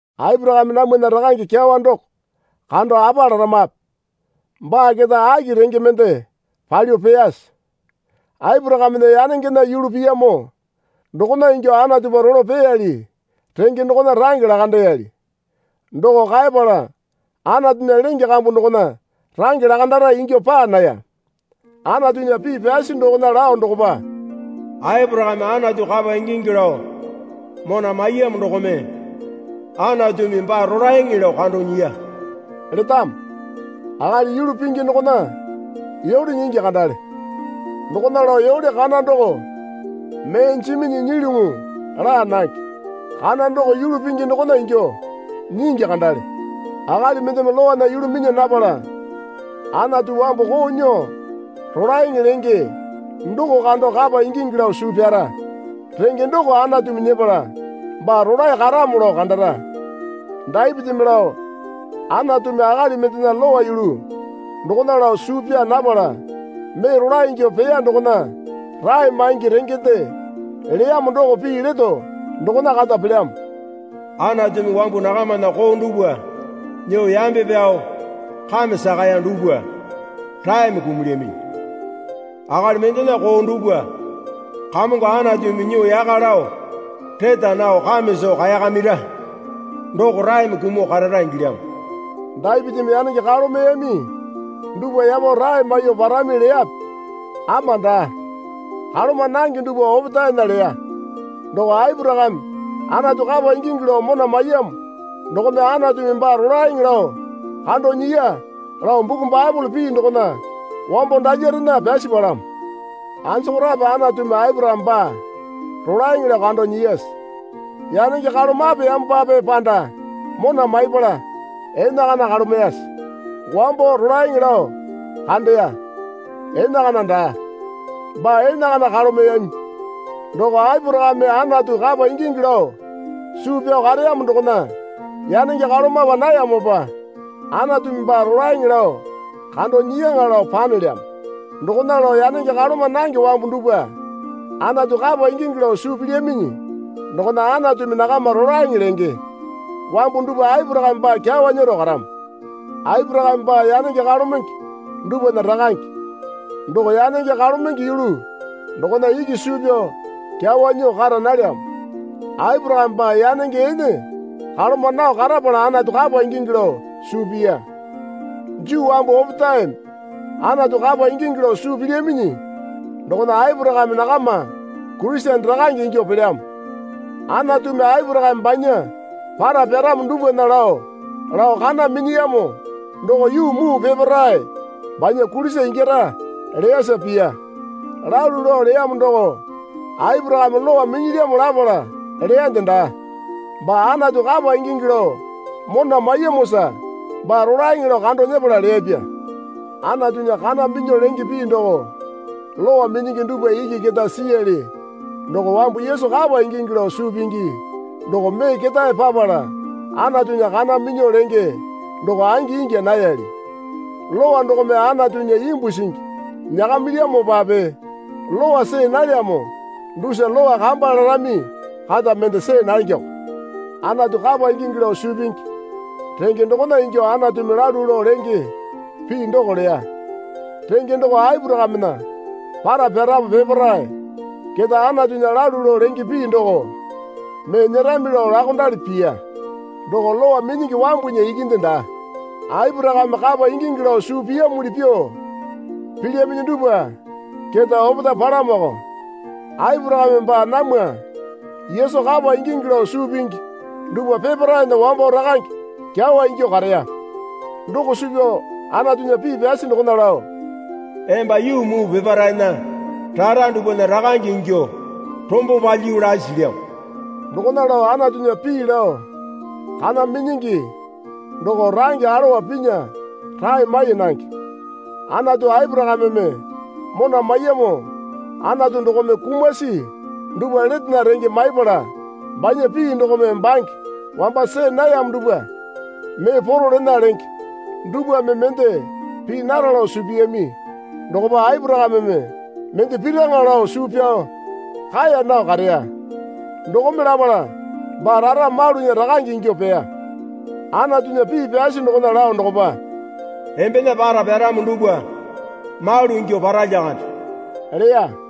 Aporakame namwana rakange kyawa doko kando apa laramape? Baa keta aki renge mende palyuo peyase? Aporakamena yanengena yulu piyamo dokona ingyuo Anatupa rolo peyali renge dokona range lakandeyali. Doko kaepala Anatunya lenge kambu dokona range lakandara ingyuo paa naya. Anatunya pii pyasi dokona lao dokopa, Aporakame Anatu kapa ingingi lao mona maiyamo dokome Anatumi baa rolaeŋe lao kando nyiya letamo. Akali yulu pingi dokona yole nyingi kandale. Dokona lao yole kana doko mee jiminyi nyilyuŋu laa nange. Kana doko yulu pingi dokona ingyuo nyingi kandale. Akali mendeme Lowana yulu minya napala Anatu wambu koo nyuo rolaeŋe lenge doko kando kapa ingingi lao suu pyara renge doko Anatumi nyepala baa rolae karamo lao kandara. Dapitimi lao Anatumi akali mendena Lowa yulu dokona lao suu pyaa napala mee rolae ingyuo peya dokona rae maingi rengende leyamo doko pii leto dokona kata pelyamo. Anatumi wambu nakamana koo dupwa nyuo yambe pyao kame sakaya dupwa raeme kumulyaminyi. Akali mendena koo dupwa Kamongo Anatumi nyuo yaka lao reta nao kame soo kaekamira doko raeme kumuo karara ingilyamo. Dapitimi yanenge kalomeyami dupwa yapo rae maiyuo parami leyape? Ama daa. Kaloma nange dupwa opetaena leya. Doko Aporakame Anatu kapa ingingi lao mona maiyamo dokome Anatumi baa rolaeŋe lao kando nyiya lao buku Baepole pii dokona wambo dalyarena pyasi palamo. Anjokorape Anatumi Aporakame baa rolaeŋe lao kando nyiyase? Yanenge kalomapeyamopape panda mona maipala enakana kalomeyase? Wambo rolaeŋe lao kandeya. Enakana daa. Baa enakana kalomeyami. Doko Aporakame Anatu kapa ingingi lao suu pyao kareyamo dokona yanenge kalomapa nayamopa Anatumi baa rolaeŋe lao kando nyiyaŋa, lao panelyamo. Dokona lao yanenge kaloma nange wambu dupwa Anatu kapa ingingi lao suu pilyaminyi dokona Anatumi nakama rolaeŋe lenge. Wambu dupwa Aporakame baa kyawa nyero karamo. Aporakame baa yanenge kalomenge dupwana rakange. Doko yanenge kalomenge yulu dokona iki suu pyao kyawa nyuo kara nalyamo. Aporakame baa yanenge ene kaloma nao karapala Anatu kapa ingingi lao suu piya. Juu wambu opetaeme Anatu kapa ingingi lao suu pilyaminyi dokona Aporakame nakama Kurisene rakange ingyuo pelyamo. Anatumi Aporakame banya para pyaramo dupwana lao lao kana minyiyamo doko yuu muu peparae banya kulisa ingyara leyasa piya. Lalu lao leyamo doko Aporakame Lowa minyilyamo lapala leyande daa. Baa Anatu kapa ingingi lao mona maiyamosa baa rolaeŋe lao kando nyepala leyapya. Anatunya kana minyuo lenge pii doko Lowa minyingi dupwa iki keta siyali doko wambu Yesu kapa ingingi lao suu pingi doko mee ketae papala Anatunya kana minyuo lenge doko angi ingya nayali. Lowa dokome Anatunya imbu singi nyakamilyamopape Lowa see nalyamo dusa Lowa kamba larami kata mende see nangeko. Anatu kapa ingingi lao suu pingi renge dokona ingyuo Anatumi lalu lao lenge pii doko leya. Renge doko Aporakamena para pyaramo peparae keta Anatunya lalu lao lenge pii doko mee nyerami lao laokondali piya. Doko Lowa minyingi wambunya ikinde daa. Aporakame kapa ingingi lao suu piyamuli pyuo pilyaminyi dupwa keta opetae palamoko. Aporakame baa namwa Yesu kapa ingingi lao suu pingi dupwa peparaena wambo rakange kyawa ingyuo kareya. Doko suu pyao Anatunya pii pyasi dokona lao, Emba yuu muu peparaena rara dupwana rakange ingyuo rombo palyiyu lasi silyamo. Dokona lao Anatunya pii lao kana minyingi doko range alowa pinya rae mai nange. Anatu Aporakameme mona maiyamo Anatu dokome kumasi dupwa letena renge maipala banya pii dokome bange wamba see nayamo dupwa mee poro lena lenge. Dupwame mende pii nara lao suu piyami dokopa Aporakameme mende piraŋa lao suu pyao kaeya nao kareya. Dokome lapala baa rara malunya rakange ingyuo peya. Anatunya pii pyasi dokona lao dokopa, Embena para pyaramo dupwa malu ingyuo para lyakande leya.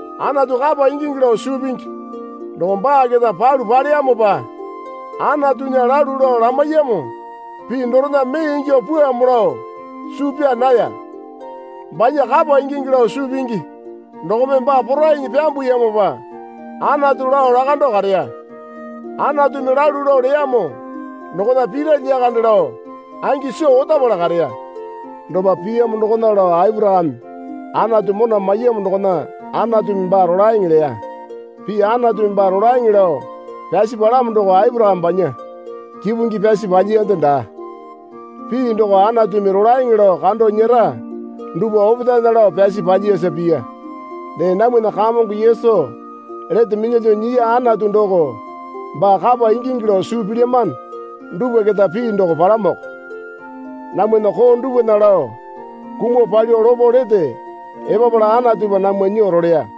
Anatu kapa ingingi lao suu pingi doko baa keta palu paleyamopa Anatunya lalu lao lamaiyamo pii dorena mee ingyuo pwuamo lao suu pyaa naya. Banya kapa ingingi lao suu pingi dokome baa porainyi pyambuyamopa Anatu lao lakando kareya. Anatumi lalu lao leyamo dokona pira lyakande lao angi soo otapala kareya. Dopa piyamo dokona lao Aporakame Anatu mona maiyamo dokona Anatumi baa rolaeŋe leya. Pii Anatumi baa rolaeŋe lao pyasi palamo doko Aporakame banya kipungi pyasi paliyande daa. Pii doko Anatumi rolaeŋe lao kando nyera dupwa opetaena lao pyasi paliyasa piya. Dee namwana Kamongo Yesu lete minyalyuo nyiya Anatu doko baa kapa ingingi lao suu pilyamano dupwa keta pii doko palamoko. Namwana koo dupwana lao kumuo palyuo lopo lete epapala Anatupa namwa nyuo roleya.